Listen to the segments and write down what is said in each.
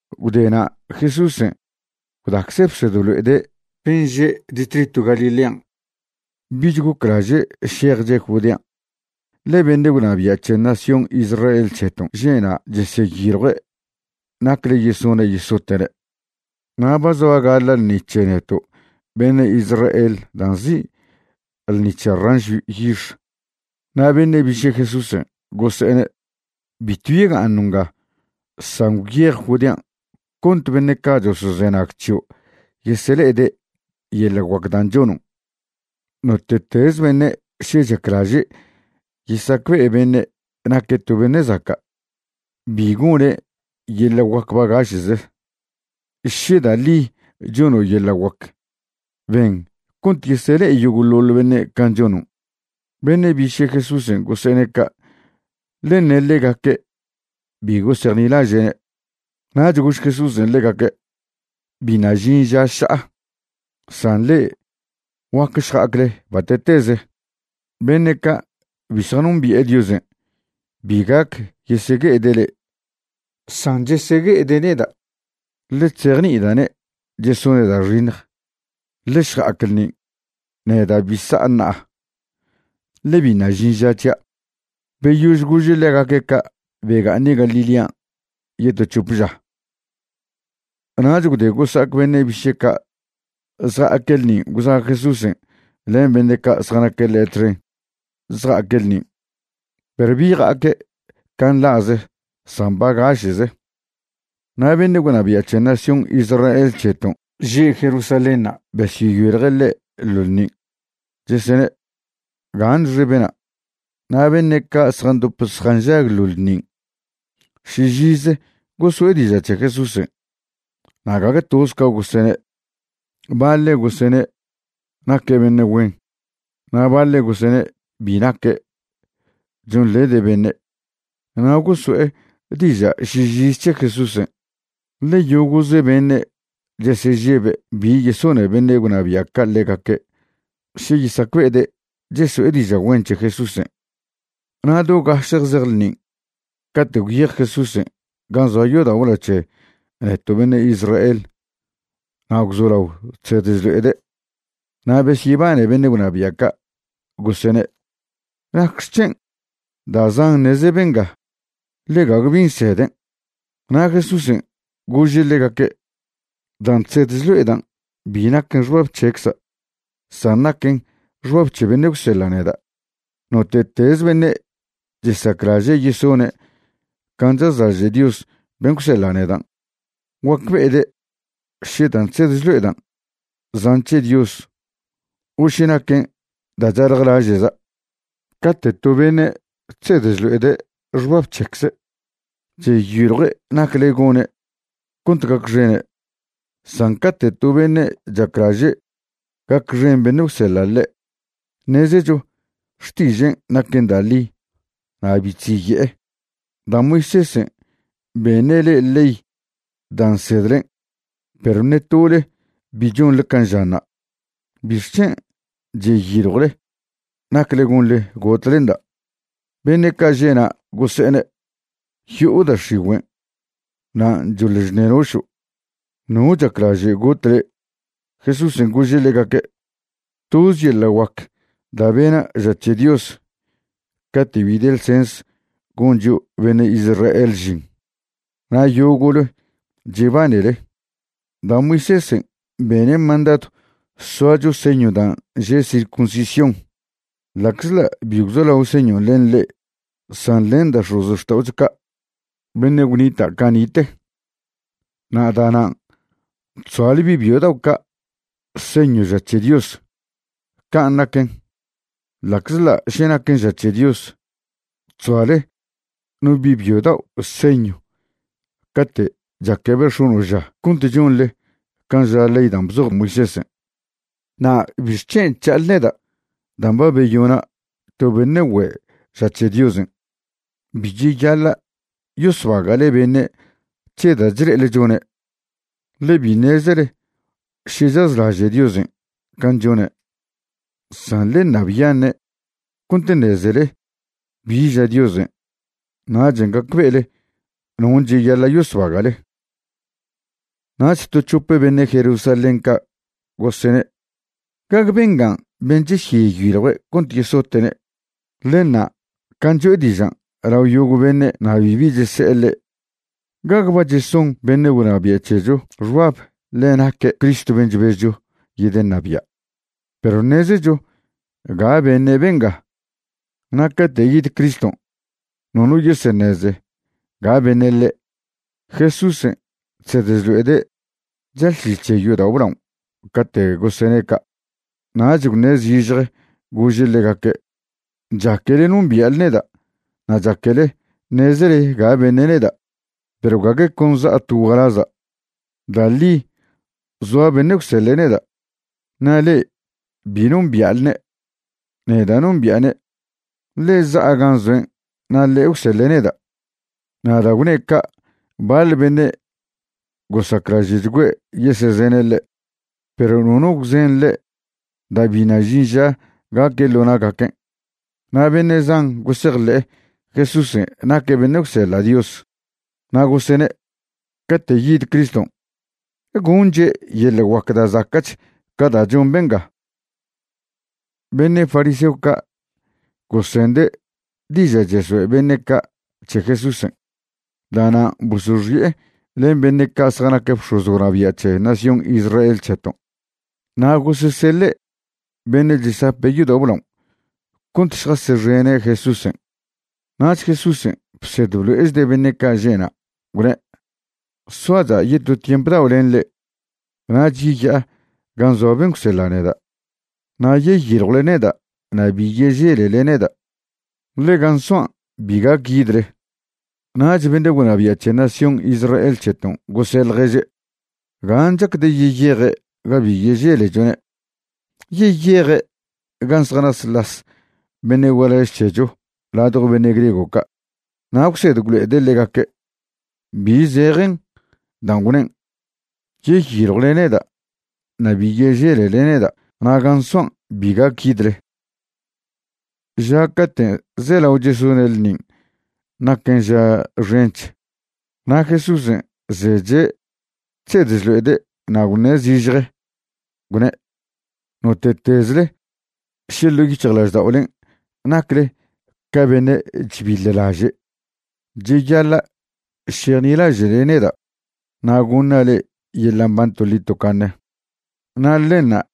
Gwde na' Jesúsen' gwdacze' bsed blo'ede' ben' že' distritw Galilean'. Bich goclaže' šejche' Judean', ḻe beṉe' gwnabia' c̱he nación Israel c̱heton' že' na' cheseyiljue' nacle yesone' yesote'ne'. Na' ba zoa gaḻa' ḻṉi c̱he neto' beṉe' Israel da' nzi' Ḻṉi c̱he Ranšw Yix. Na' beṉe' biše' Jesúsen' gose'ene': ―Bitw yega'aṉo' nga. San gwyej Judean' cont beṉe' ca' chosozenag c̱hio' yesele'ede' yeḻa' guac dan' chonon'. Note'teze beṉe' še chaclaže' yesacbe'e beṉe' naque' to beṉe' zaca', bi gone' yeḻa' guac bagaše'ze. Še da' ḻi chono' yeḻa' guac, ben cont yesele'e yogo'ḻoḻ beṉe' can' chonon'. Beṉe' biše' Jesúsen' gose'ene' ca', ḻe ṉe ḻegaque' bi gosejnilaže'ne'. Nach gož Jesúsen' ḻegaque': ―Biṉa' žin ža ša'a, san le'e guac šja'acle bate'teze. Beṉe' ca' bi zjanombi'e Diosen' bi gac yesegue'ede' le'e, san chesegue'ede' neda', ḻe chzejni'ida'ne' chesone' da' xiṉj. Ḻe šja'ac ḻṉin'. Neda' bi sa'a ṉa'a, ḻe biṉa' žin ža c̱hia'. Beyož gože' ḻegaque' ca' bega'aṉe' Galilean' yeto c̱hop ža. Nach gwde gosa'ac beṉe' biše' ca' zja'aque' ḻṉin' gwza' Jesúsen' len beṉe' ca' zjanaque' ḻe' txen zja'aque' ḻṉin', perw bi ja'aque' can' nḻa'ze san bagaše'ze. Na' beṉe' gwnabia' c̱he nación Israel c̱heton' že' Jerusalénṉa' besyeyiljue' ḻe' ḻo ḻṉin', chesene': ―¿Gaṉxe bena'? Na' beṉe' ca' zjandop zjanžag ḻo ḻṉin' šižize goso'e diža' c̱he Jesúsen', na' gague toze ca gosene'. Baḻe' gosene': “Naque' beṉe' güen”, na' baḻe' gosene': “Bi naque', chonḻede' beṉe'.” Na' goso'e diža' šižize c̱he Jesúsen', ḻe yogo'ze beṉe' chesežebe' bi yesone beṉe' gwnabia' ca' ḻegaque' še yesacbe'ede' cheso'e diža' güen c̱he Jesúsen'. Na' do gašje zej ḻṉin' cate' gwyej Jesúsen' gan' zoa yodao' blao c̱he neto' beṉe' Israel na' gwzolao chsed chlo'ede'. Na' besyebane beṉe' gwnabia' ca', gosene': ―¿Nacxec̱hen' da' zan ṉeze benga? ḻe gague bi nseden'. Na' Jesúsen' gože' ḻegaque': ―Dan' chsed chlo'edan' bi naquen xbab c̱hecza', san naquen xbab c̱he beṉe' gwseḻa' neda'. Note'tez beṉe' chesaclaže' yesone' can' chazlaže' Dios ben' gwseḻa' nedan', guacbe'ede' še dan' chsed chlo'edan' zan' c̱he Dios o še naquen da' chaljlaže'za'. Cate' to beṉe' chsed chlo'ede' xbab c̱hecze', cheyiljue' nacle gone' cont gacxene'. San cate' to beṉe' chaclaže' gacxen beṉe' gwseḻa' ḻe', ṉezecho xtižen' naquen da' ḻi na' bi chziye'e. ’Da' Moisésen' beṉe' le'e ley dan' nsedlen' perw ṉe tole bi chonḻe can' žanṉa'. ¿Bixc̱hen' cheyiljwle nacle gonḻe gotlenda'? Beṉe' ca' že'na' gose'ene': ―Yo'o da' x̱igüen', nan' choḻ chṉenošo'. ¿No chaclaže' got le'? Jesúsen' gože' ḻegaque': ―Toz yeḻa' guac da' bena' ža c̱he Dios cate' bi de ḻsens gon chio' beṉe' Israel žin, na' yogo'le chebanele. Da' Moisésen' bene' mandadw soacho señw dan' že' circuncisión (ḻa'czḻa' bi gwzolao señon' len ḻe' san len da' x̱ozxta'ocho ca' beṉe' gwnita' cani'te), na' da'nan' chzoale bi' byo dao' ca' señwna' ža c̱he Dios. Can' naquen, ḻa'czḻa' še naquen ža c̱he Dios, chzoale no bi' byo dao' señw cate' chaquebe' x̱ono' ža cont chonḻe can' ža ley dan' bzoj Moisésen', na' ¿bixc̱hen' chža'ale neda' dan' ba beyona' to beṉe' güe' ža c̱he Diosen'? Bi cheyaḻa' yosbaga'le beṉe' c̱he da' chle'ele chone', ḻe bi ṉezele še chazlaže' Diosen' can' chone', san ḻe ṉabyaṉe' cont ṉezele bi ža Diosen', nachen' gacbe'ele non' cheyaḻa' yosbaga'le. Nach to c̱hope beṉe' Jerusalén ca' gosene': ―¿Gague benga ben' chesyeyiljue' cont yesote'ne'? Ḻe ṉa' can' cho'e dižan' lao yogo' beṉe' na' bibi chese'e ḻe'. ¿Gague ba cheson beṉe' gwnabia' c̱hecho xbab ḻe naque' Cristo ben' chbezcho yedeṉabia'? Perw ṉezecho ga beṉe' benga, na' cate' yid Criston' nono yeseṉeze ga beṉe' ḻe'. Jesúsen' chsed chlo'ede' chalšil c̱he yodao' blao cate' gosene' ca'. Nach gwṉe' zižje gože' ḻegaque': ―Chaquele nombia'le neda' na' chaquele ṉezele ga beṉe' neda'. Perw gague con za'a to gualaza'. Da' ḻi zoa beṉe' gwseḻe' neda', na' le'e bi nombia'lne'. Neda' nombi'ane', ḻe za'a gan' zoen' na' ḻe' gwseḻe' neda'. Na' da' gwne' ca' baḻ beṉe' gosaclaže'chgüe' yesezene' ḻe', perw nono gwzen ḻe' da' biṉa' žin ža gaque' ḻo na'gaquen'. Na' beṉe' zan gosejḻe'e Jesúsen' naque' beṉe' gwseḻa' Dios, na' gosene': ―Cate' yid Criston' ¿gonche' yeḻa' guac da' zaca'ch ca da' chon benga? Beṉe' fariseo ca' gosende' diža' cheso'e beṉe' ca' c̱he Jesúsen'. Da'nan' bosoxi'e len beṉe' ca' zjanac bx̱oz gwnabia' c̱he nación Israel c̱heton' na' goseseḻe' beṉe' chesape' yodao' blaon' cont šjasexene' Jesúsen'. Nach Jesúsen' bsed blo'echde' beṉe' ca' že'na', gwne': ―Soacha' yeto tiemp dao' len le'e nach yeya'a gan' zoa ben' gwseḻa' neda'. Na' yeyiljwle neda' na' bi yeželele neda', ḻe gan' soan' bi gac yidle. Nach beṉe' gwnabia' c̱he nación Israel c̱heton' gose' ḻježe': ―¿Gan' chacde' yeyeje' ga bi yeželechone'? ¿Yeyeje' gan' zjanasḻas beṉe' gualaž c̱hecho ladjo beṉe' griego ca' na' gwsed gwlo'ede' ḻegaque'? ¿Bi zejen dan' gwnen': “Yeyiljwle neda' na' bi yeželele neda' na' gan' soan' bi gac yidle”? Ža cate' zelao chesone' ḻṉin' naquen ža xench, na' Jesúsen' zeche' chsed chlo'ede' na' gwṉe' zižje, gwne': ―Note'tezle še ḻo' yic̱hjlažda'olen' nacle ca beṉe' chbiḻlaže', cheyaḻa' šejnilaže'le neda' na' goṉa' le'e yeḻa' mban toḻi tocaṉe, na' ḻenṉa'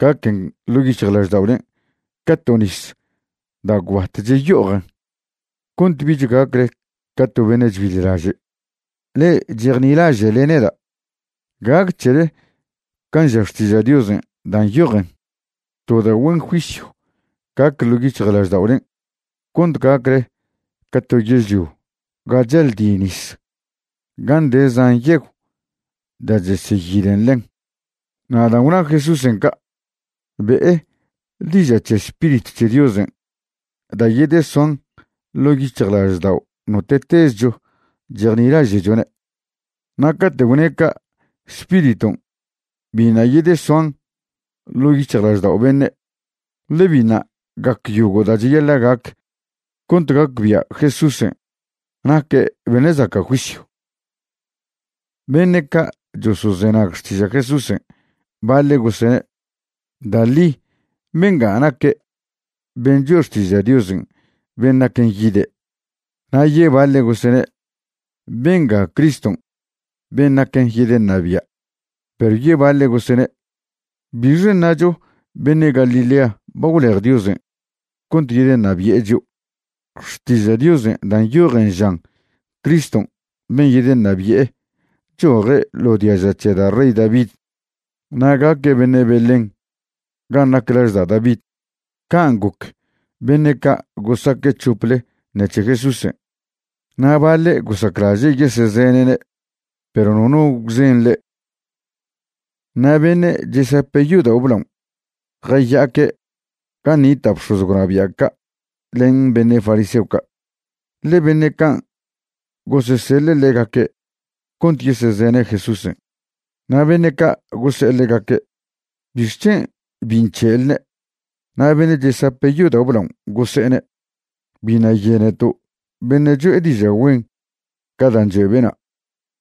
gaquen ḻo' yic̱hjlažda'olen' ca to nis da' gwbat cheyo'ojen cont bich gacle ca to beṉe' chbiḻlaže'. Le'e chejnilaže'le neda', gac c̱hele can' ža Xtiža' Diosen' da' nyojen, to da' güen juisyw gac ḻo' yic̱hjlažda'olen' cont gacle ca to yežlio ga chaldi nis, gan' de zan yegw da' cheseyilen ḻen. Na' dan' gwna Jesúsen' ca' be'e diža' c̱he Spiritw c̱he Diosen' da' yedesoan ḻo' yic̱hjlaždao' note'tezcho chejnilaže'chone'. Na' caten' gwne' ca' Spiriton' biṉa' yedesoan ḻo' yic̱hjlaždao' beṉe', ḻe biṉa' gac yogo' da' cheyaḻa' gac cont gacbia' Jesúsen' naque' beṉe' zaca' juisyw. Beṉe' ca' chosozenag xtiža' Jesúsen' baḻe' gosene': ―Da' ḻi benga naque' ben' choe' xtiža' Diosen' ben' naquen yide'. Na' yebaḻe' gosene': ―Benga Criston' ben' naquen yedeṉabia'. Perw yebaḻe' gosene': ―¿Bixe ṉacho beṉe' Galilea ba gwlej Diosen' cont yedeṉabi'e chio'? Xtiža' Diosen' da' nyojen žan Criston' ben' yedeṉabi'e choje' ḻo diaža c̱he da' rey David na' gaque' beṉe' Belén gan' nac laž da' David. Can' goc beṉe' ca' gosaque' c̱hople ṉec̱he Jesúsen'. Na' baḻe' gosaclaže' yesezene'ne', perw nono gwzen ḻe'. Na' beṉe' chesape' yodao' blaon' jaya'aque' gan' nita' bx̱oz gwnabia' ca' len beṉe' fariseo ca', ḻe beṉe' can' goseseḻe' ḻegaque' cont yesezene' Jesúsen'. Na' beṉe' ca' gose'e ḻegaque': ―¿Bixc̱hen' bi nc̱he'elne'? Na' beṉe' chesape' yodao' blaon' gose'ene': ―Biṉa' yeneto' beṉe' cho'e diža' güen ca dan' choe' bena'.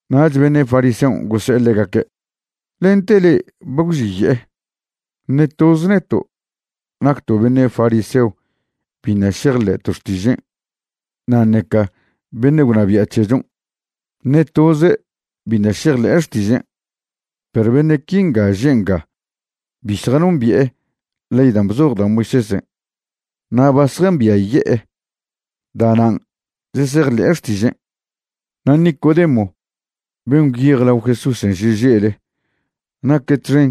Nach beṉe' fariseon' gose'e ḻegaque': ―¿Lente le'e ba gwxiye'e? Ṉe toz neto' nacto' beṉe' fariseo biṉa' šejḻe'to' xtižen' na' ṉeca beṉe' gwnabia' c̱hechon', ṉe toze' biṉa' šejḻe'e xtižen'. Perw beṉe' quinga že' nga bi zjanombi'e ley dan' bzoj da' Moisésen' na' ba zjambiaye'e, da'nan' chesejḻe'e xtižen'. Na' Nicodemo ben' gwyej lao Ješusen' šeže'le naque' txen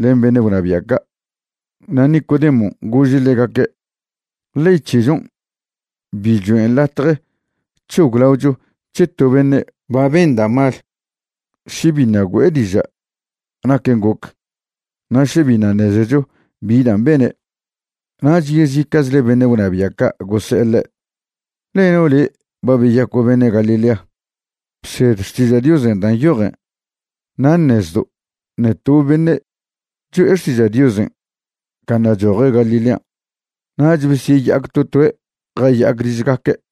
len beṉe' gwnabia' ca'. Na' Nicodemon' gože' ḻegaque': ―Ley c̱hechon' bi choen' latje c̱hoglaocho c̱he to beṉe' ba ben da' mal še biṉa' güe'e diža' naquen' goc na' še biṉa' ṉezecho bi dan' bene'. Nach yezica'chle beṉe' gwnabia' ca' gose'e ḻe': ―¿Leno' le' ba beyaco' beṉe' Galilea? Bsed Xtiža' Diosen' da' nyojen na' ṉezdo' ṉe to beṉe' choe' xtiža' Diosen' ca ṉa' choje' Galilean'. Nach besyeya'ac to toe' jaya'ac ližgaque'.